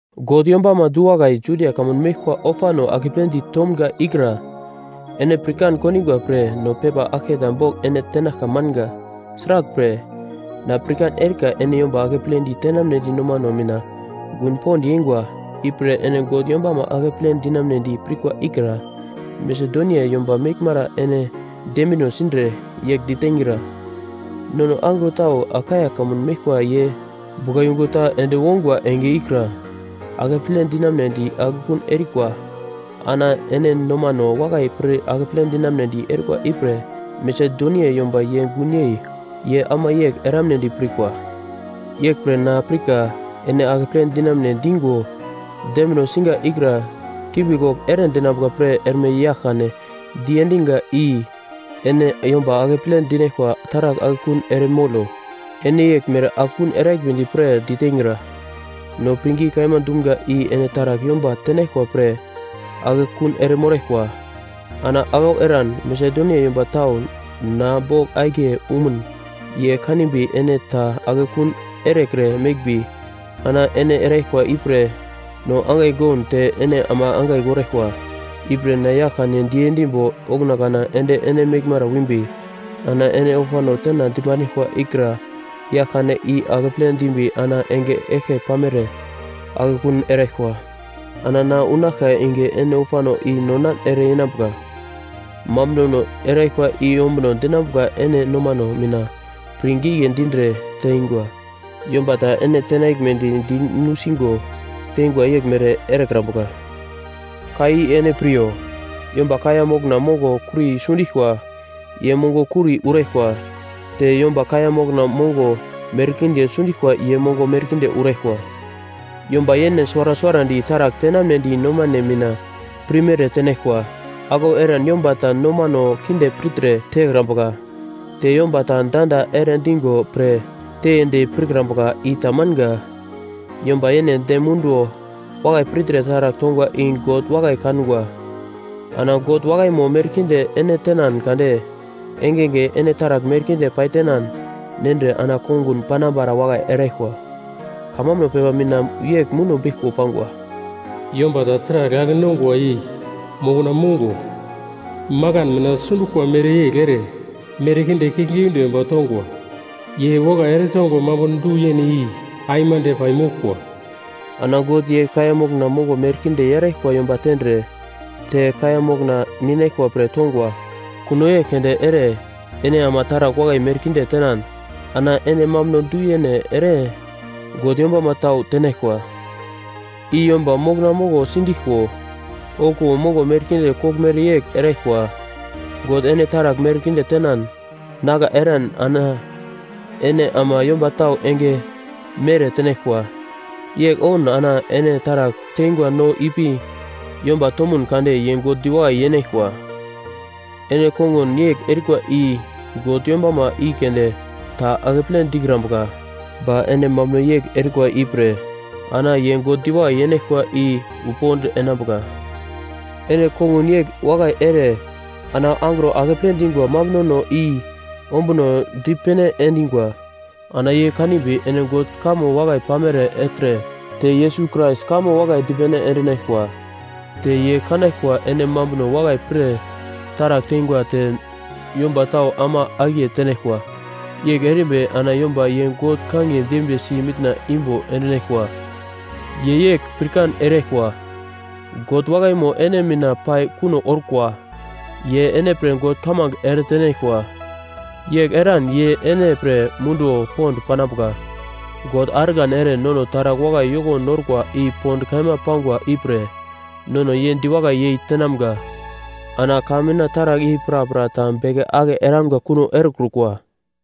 God yombama du-wakai Judia kamun meglkwa ofano akepledi tomga ikra ene pirkan kondingwa pre no pepa aglketa bogl ene tenaglka manga. Sraglpre, na pirkan erika ene yomba akepledi tenamnedi nomano mina gun pond yeingwa, ipre ene God yombama akeple dinamunedi pirkwa ikra Masedonia yomba meglmara ene dembino sindre, yegl diteingra, “Nono angro tau Akaia kamun meglkwa ye buglayungu ta ende wongwa enge ikra akeple dinamunedi akekun erikwa.” Ana ene nomano wakai pir akeple dinamunedi erikwa ipre Masedonia yomba ye gun yei ye ama yegl eramnedi pirkwa. Yeglpre na pirka ene akeple dinamune dingo dembino siga ikra kimbi-kogl ere dinambuka pre erme yagl-kane diendiga i ene yomba akeple dinaglkwa taragl akekun ere molo. Ene yeglmere akekun eraglmedi pre diteingra. No pirngi kaima dumga i ene taragl yomba tenaglkwa pre akekun ere moraglkwa. Ana aglau eran, Masedonia yomba tau na bogl akiye umun ye kanimbi ene ta akekun erekre meglmbi, ana ene eraglkwa ipre no angai goun te ene ama angai goraglkwa. Ipre na yagl-kane diendimbo okuna kana ende ene meglmara wimbi ana ene ofano tena dipandiglkwa ikra yagl-kane i akeple dimbi ana enge eglke pamere akekun eraglkwa. Ana na unaglka enge ene ofano i non-nan ere yenambuka. Mambunono eraglkwa i ombuno dinambuka ene nomano mina pir gigle dindre teingwa, yomba ta ene tenaglmedi di nusigo teingwa yeglmere erekrambuka. Ka i ene piryo: Yomba kaiya mokna mongo kuri sundiglkwa, ye mongo kuri uraglkwa; te yomba kaiya mokna mongo merkinde sundiglkwa ye mongo merkinde uraglkwa. Yomba yene suwara suwarandi taragl tenamnedi nomane mina pirmere tenaglkwa, aglau eran yomba ta nomano kinde pirtre tekrambuka, te yomba ta danda ere digo pre teiyedi pirkrambuka i tamanga. Yomba yene dem munduwo wakai pirtre taragl tongwa i God wakai kangwa. Ana God wakaimo merkinde ene tenan kade engenge ene taragl merkinde paitenan nendre ana kongun panambara wakai eraglkwa. Kamambuno pepa mina yegl muno beglko pangwa: “Yomba ta taragl ake-nongwa i mokna mongo makan mina sinduglkwa mereyegl ere merkinde kiuglgiunde yomba tongwa, ye wakai eretongwa mambuno du-yene i aimande pai moglkwa.” Ana God ye kaiya mokna mongo merkinde yaraglkwa yomba tendre te kaiya mokna ninaglkwa pre tongwa. Kuno yegl keunde ere ene ama taragl wakai merkinde tenan, ana ene mambuno du-yene ere God yombama tau tenaglkwa. I yomba mokna mongo sindiglko okuwo mongo merkinde koglmere yegl eraglkwa. God ene taragl merkinde tenan nagla eran ana ene ama yomba tau enge mere tenaglkwa. Yegl oun ana ene taragl teingwa no ipi yomba tomun kade ye God diwakai yenaglkwa. Ene kongun yegl erikwa i God yombama i keunde ta akeple dikrambuka ba ene mambuno yegl erikwa ipre ana ye God diwakai yenaglkwa i wu pond enambuka. Ene kongun yegl wakai ere ana angro akeple dingwa mambunono i ombunodi pene endingwa. Ana ye kanimbi ene God kamo wakai pamere ertre te Yesus Krais kamo wakai dipene endinaglkwa. Te ye kanaglkwa ene munduno wakai pre taragl teingwa te yomba tau ama akiye tenaglkwa. Yegl erimbi ana yomba ye God kangiye dembiye si mitna imbo endinaglkwa. Ye yegl pirkan eraglkwa, God wakaimo ene mina pai kuno orkwa. Ye ene pre God kamange eretenaglkwa. Yegl eran ye ene pre munduwo pond panambuka. God argan ere nono taragl wakai yoko norkwa i pond kaima pangwa ipre nono ye diwakai yei tenamga. Ana ka mina taragl i prapra ta beke ake eramga kuno erekrukwa.